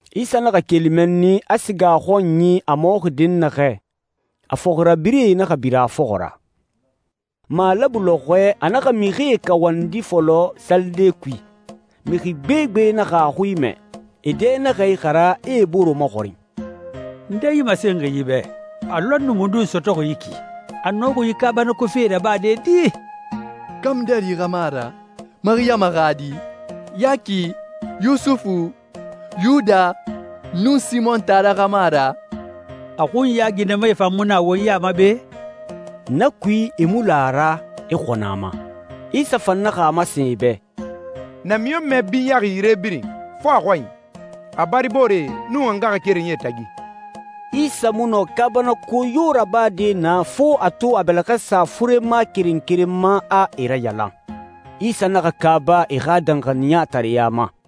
Isa naxa keli mɛnni, a siga a xɔnyi, a mɔxi dɛnnaxɛ. A fɔxirabirɛe naxa bira a fɔxɔ ra. Malabu lɔxɔɛ, a naxa mixie kawandi fɔlɔ salide kui. Mixi gbegbe naxa a xui mɛ. E dɛ naxa ixara, e e bore maxɔrin, «Nde yi masenxi yi bɛ? A lɔnni mundun sɔtɔxi yi ki? A nɔxi yi kaabanako fee rabade di? Kamudɛri xa mu a ra, Mariyama xa di? Yaki, Yusufu, Yuda, nun Simɔn taara xa mu a ra? A xunya ginɛmae fan mu na won ya ma be?» Na kui, e mu la a ra, e xɔnɔ a ma. Isa fan naxa a masen e bɛ, «Namiɲɔnmɛ binyaxi yire birin, fo a xɔnyi, a baribooree, nun a ngaxakerenyie tagi.» Isa mu nɔ kaabanako yo rabade naa, fo a to a bɛlɛxɛ sa furema keren keren ma, a e rayalan. Isa naxa kaaba e xa danxaniyatareɲa ma.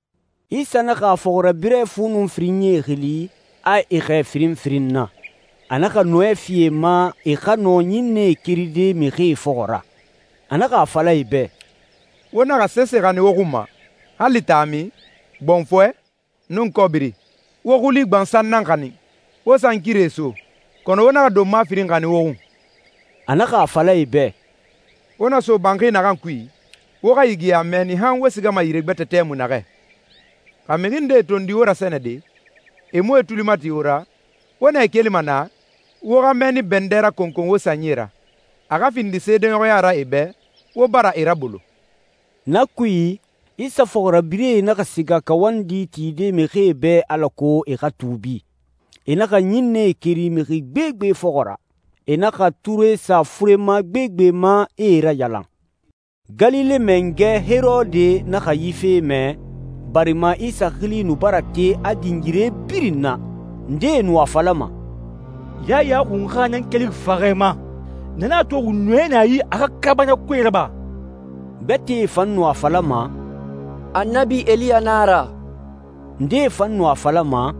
Isa naxa a fɔxirabirɛ fu nun firinyie xili, a e xɛɛ firin firin na. A naxa nɔɛ fi e ma e xa nɔ ɲinnɛe keride mixie fɔxɔ ra. A naxa a fala e bɛ, «Wo naxa sese xanin wo xun ma, hali taami, gbɔnfɔɛ, nun kɔbiri. Wo xuli gbansan nan xanin. Wo sankirie so, kɔnɔ wo naxa donma firin xanin wo xun.» A naxa a fala e bɛ, «Wo na so banxi naxan kui, wo xa yigiya mɛnni nɛ han wo sigama yire gbɛtɛ tɛmui naxɛ. Xa mixi ndee tondi wo rasɛnɛde, e mu e tuli mati wo ra, wo nɛ kelima naa, wo xa mɛnni bɛndɛ rakɔnkɔn wo sanyie ra, a xa findi seedeɲɔxɔya ra e bɛ, wo bara e rabolo.» Na kui, Isa fɔxirabirɛe naxa siga kawandi tide mixie bɛ alako e xa tuubi. E naxa ɲinnɛe keri mixi gbegbe fɔxɔ ra. E naxa ture sa furema gbegbe ma, e e rayalan. Galile mangɛ Herode naxa yi fe mɛ, barima Isa xili nu bara te, a din yire birin na. Ndee nu a falama, «Yaya Xunxa nan kelixi faxɛ ma. Na nan a toxi nɔɛ na a yi a xa kaabanakoe raba.» Gbɛtɛe fan nu a falama, «Annabi Eliya na a ra.» Ndee fan nu a falama,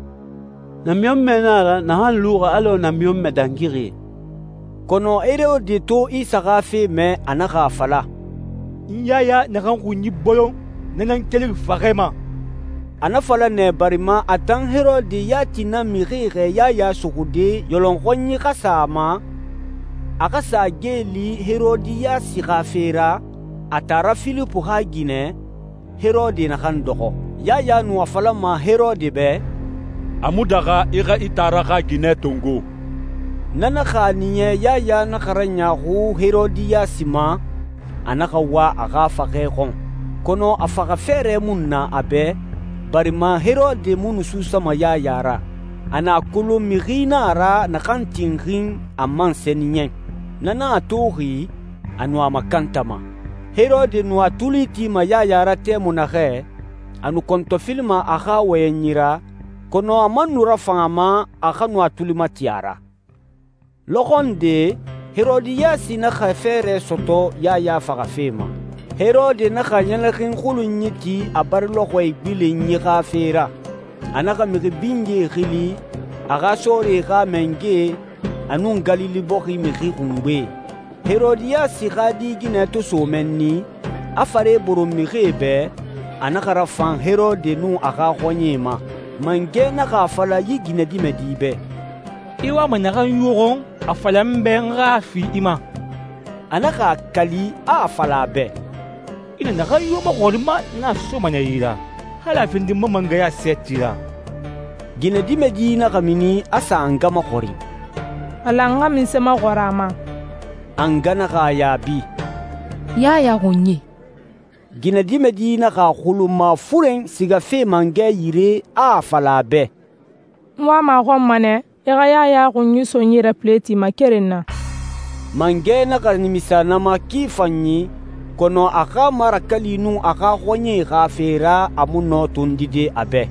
«Namiɲɔnmɛ nan a ra naxan luxi alɔ namiɲɔnmɛ dangixie.» Kɔnɔ Herode to Isa xa fe mɛ, a naxa a fala, «N Yaya naxan xunyi bolon, na nan kelixi faxɛ ma.» A na fala nɛ, barima a tan Herode yati nan mixie xɛɛ Yaya suxude, yɔlɔnxɔnyi xa sa a ma, a xa sa geeli Herodiyasi xa fe ra, a taara Filipu xa ginɛ, Herode naxan dɔxɔ. Yaya nu a falama Herode bɛ, «A mu daxa i xa i taara xa ginɛ tongo.» Na naxa a niya Yaya naxa raɲaaxu Herodiyasi ma, a naxa wa a xa faxɛ xɔn. Kɔnɔ a faxa fɛɛrɛ mu nu na a bɛ, barima Herode mu nu suusama Yaya ra. A nu a kolon mixi na a ra, naxan tinxin, a man sɛniyɛn. Na na a toxi, a nu a makantama. Herode nu a tuli tima Yaya ra tɛmui naxɛ, a nu kɔntɔfilima a xa wɔyɛnyi ra, kɔnɔ a man nu rafan a ma a xa nu a tuli mati a ra. Lɔxɔ nde, Herodiyasi naxa fɛɛrɛ sɔtɔ Yaya faxafe ma. Herode naxa ɲɛlɛxin xulunyi ti a bari lɔxɔɛ igbilenyi xa fe ra. A naxa mixi binyee xili, a xa sɔɔrie xa mangɛe, a nun Galile bɔxi mixi xungbee. Herodiyasi xa di ginɛ to so mɛnni, a fare boron mixie bɛ, a naxa rafan Herode nun a xa xɔɲɛe ma. Mangɛ naxa a fala yi ginɛdimɛdi bɛ, «I wama naxan yo xɔn, a fala n bɛ n xa a fi i ma.» A naxa a kali, a a fala a bɛ, «I na naxan yo maxɔrin n ma, n na soma nɛ i yi ra, hali a findi n ma mangɛya sɛɛti ra.» Ginɛdimɛdi naxa mini a sa a nga maxɔrin, «A lan n xa munse maxɔrin a ma?» A nga naxa a yaabi, «Yaya xunyi.» Ginɛdimɛdi naxa a xulun mafuren sigafe mangɛ yire, a a fala a bɛ, «N wama a xɔn ma nɛ, i xa Yaya xunyi so n yi ra pileti ma keren na.» Mangɛ naxa nimisa na ma ki fanyi, kɔnɔ a xa marakali nun a xa xɔɲɛe xa fe ra, a mu nɔ tondide a bɛ.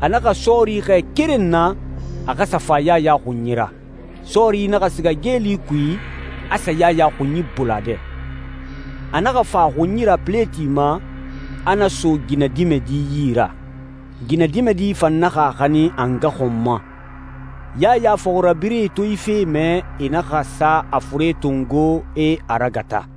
A naxa sɔɔri xɛɛ keren na, a xa sa fa Yaya xunyi ra. Sɔɔri naxa siga geeli kui, a sa Yaya xunyi bolon a dɛ i. A naxa fa a xunyi ra pileti ma, a na so ginɛdimɛdi yi ra. Ginɛdimɛdi fan naxa a xanin a nga xɔn ma. Yaya fɔxirabirɛe to yi fe mɛ, e naxa sa a fure tongo, e a ragata.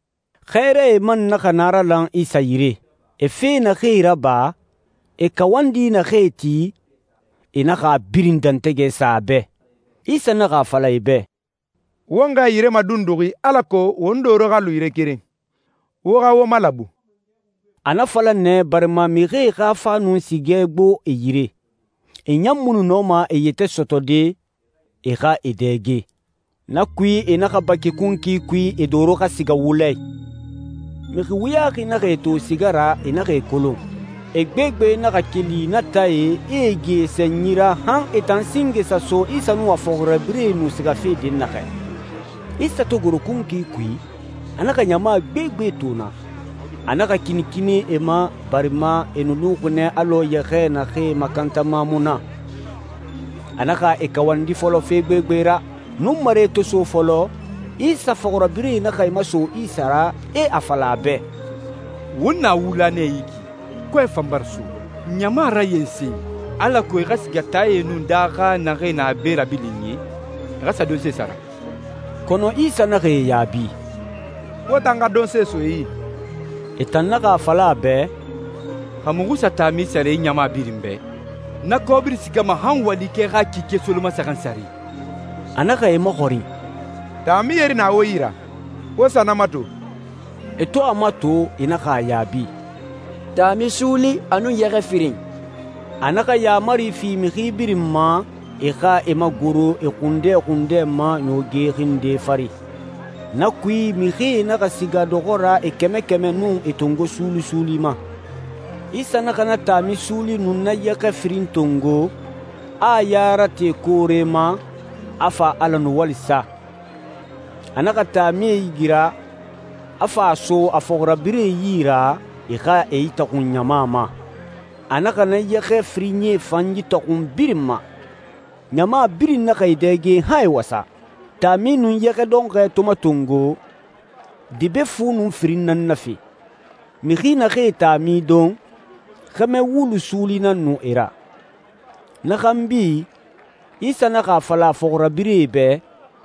Xɛɛrae man naxa naralan Isa yire. E fe naxee raba, e kawandi naxee ti, e naxa a birin dɛntɛgɛ sa a bɛ. Isa naxa a fala e bɛ, «Won xɛɛ yire madunduxi alako won doro xa lu yire keren, wo xa wo malabu.» A na fala nɛ, barima mixie xa fa nun sigɛ gbo e yire. E ɲan mu nu nɔma e yɛtɛ sɔtɔde, e xa e dɛge. Na kui, e naxa baki kunkui kui, e doro xa siga wula i. Mixi wuyaxi naxa e to siga ra, e naxa e kolon. E gbegbe naxa keli na taae, e e gi e sanyi ra han e tan singe sa so Isa nun a fɔxirabirɛe nu sigafe dɛnnaxɛ. Isa to goro kunkui kui, a naxa ɲama gbegbe to naa. A naxa kinikini e ma, barima e nu luxi nɛ alɔ yɛxɛɛ naxee makantama mu na. A naxa e kawandi fɔlɔ fe gbegbe ra. Nunmare to so fɔlɔ, Isa fɔxirabirɛe naxa e maso Isa ra, e a fala a bɛ, «Won na wula nɛ yi ki, kɔɛ fan bara so. Ɲama rayensen alako e xa siga taae nun daaxae naxee na be rabilinyi, e xa sa donsee sara.» Kɔnɔ Isa naxa e yaabi, «Wo tan xa donse so e yi.» E tan naxa a fala a bɛ, «Xa muxu sa taami sara yi ɲama birin bɛ, na kɔbiri sigama han walikɛ xa kike solomasaxan sare!» A naxa e maxɔrin, «Taami yeri na wo yi ra? Wo sa na mato.» E to a mato, e naxa a yaabi, «Taami suuli, a nun yɛxɛ firin.» A naxa yaamari fi mixi birin ma, e xa e magoro e xundɛ xundɛ ma ɲooge xinde fari. Na kui, mixie naxa siga dɔxɔ ra e kɛmɛ kɛmɛ nun e tongo suuli suuli ma. Isa naxa na taami suuli nun na yɛxɛ firin tongo, a a ya rate koore ma, a fa Ala nuwali sa. A naxa taamie igira, a fa a so a fɔxirabirɛe yi ra, e xa e itaxun ɲama ma. A naxa na yɛxɛ firinyie fan itaxun birin ma. Ɲama birin naxa e dɛge han e wasa. Taami nun yɛxɛ dɔnxɔɛ to matongo, debe fu nun firin nan nafe. Mixi naxee taami don, xɛmɛ wulu suuli nan nu e ra. Na xanbi, Isa naxa a fala a fɔxirabirɛe bɛ,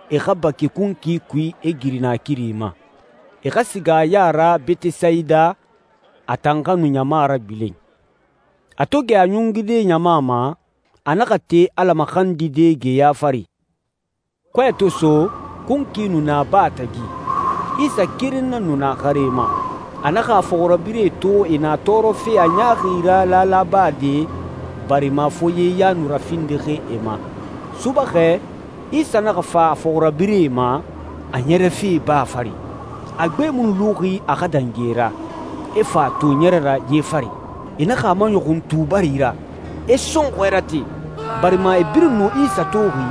e xa baki kunkui kui, e giri naakiri ma. E xa siga a ya ra Betesayida, a tan xa nu ɲama ragbilen. A to gɛ a ɲungude ɲama ma, a naxa te Ala maxandide geya fari. Kɔɛ to so, kunkui nu na baa tagi. Isa keren nan nu na xare ma. A naxa a fɔxirabirɛe to e na tɔɔrɔfe a ɲaaxi ra laala bade, barima foye ya nu rafindixi e ma. Subaxɛ, Isa naxa fa a fɔxirabirɛe ma, a ɲɛrɛfe baa fari. A gbe mu nu luxi a xa dangi e ra, e fa a to ɲɛrɛ ra ye fari. E naxa a maɲɔxun tubari ra, e sɔnxɔɛ rate, barima e birin nu Isa toxi,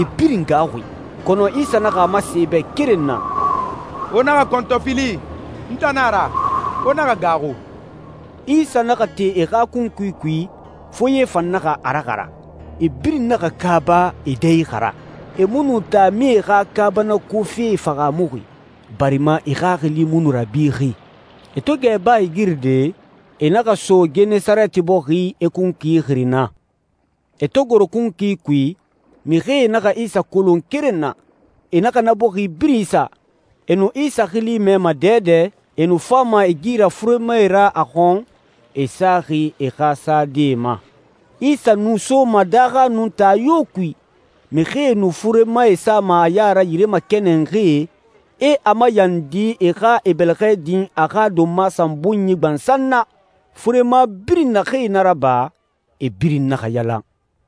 e birin gaaxuxi. Kɔnɔ Isa naxa a masen e bɛ keren na, «Wo naxa kɔntɔfili, n tan nan a ra. Wo naxa gaaxu.» Isa naxa te e xa kunkui kui, foye fan naxa a raxara. E birin naxa kaaba, e dɛ ixara. E mu nu taamie xa kaabanako fe fahaamuxi, barima e xaxili mu nu rabixi. E to gɛ baa igiride, e naxa so Genesareti bɔxi, e kunkui xiri naa. E to goro kunkui kui, mixie naxa Isa kolon keren na, e naxa na bɔxi birin isa. E nu Isa xili mɛma dɛdɛ, e nu fama e gi ra furemae ra a xɔn, e saxi e xa sadee ma. Isa nu soma daaxa nun taa yo kui, mixie nu furemae sama a ya ra yire makɛnɛnxie, e a mayandi e xa e bɛlɛxɛ din a xa donma sanbunyi gbansan na. Furema birin naxee na raba, e birin naxa yalan.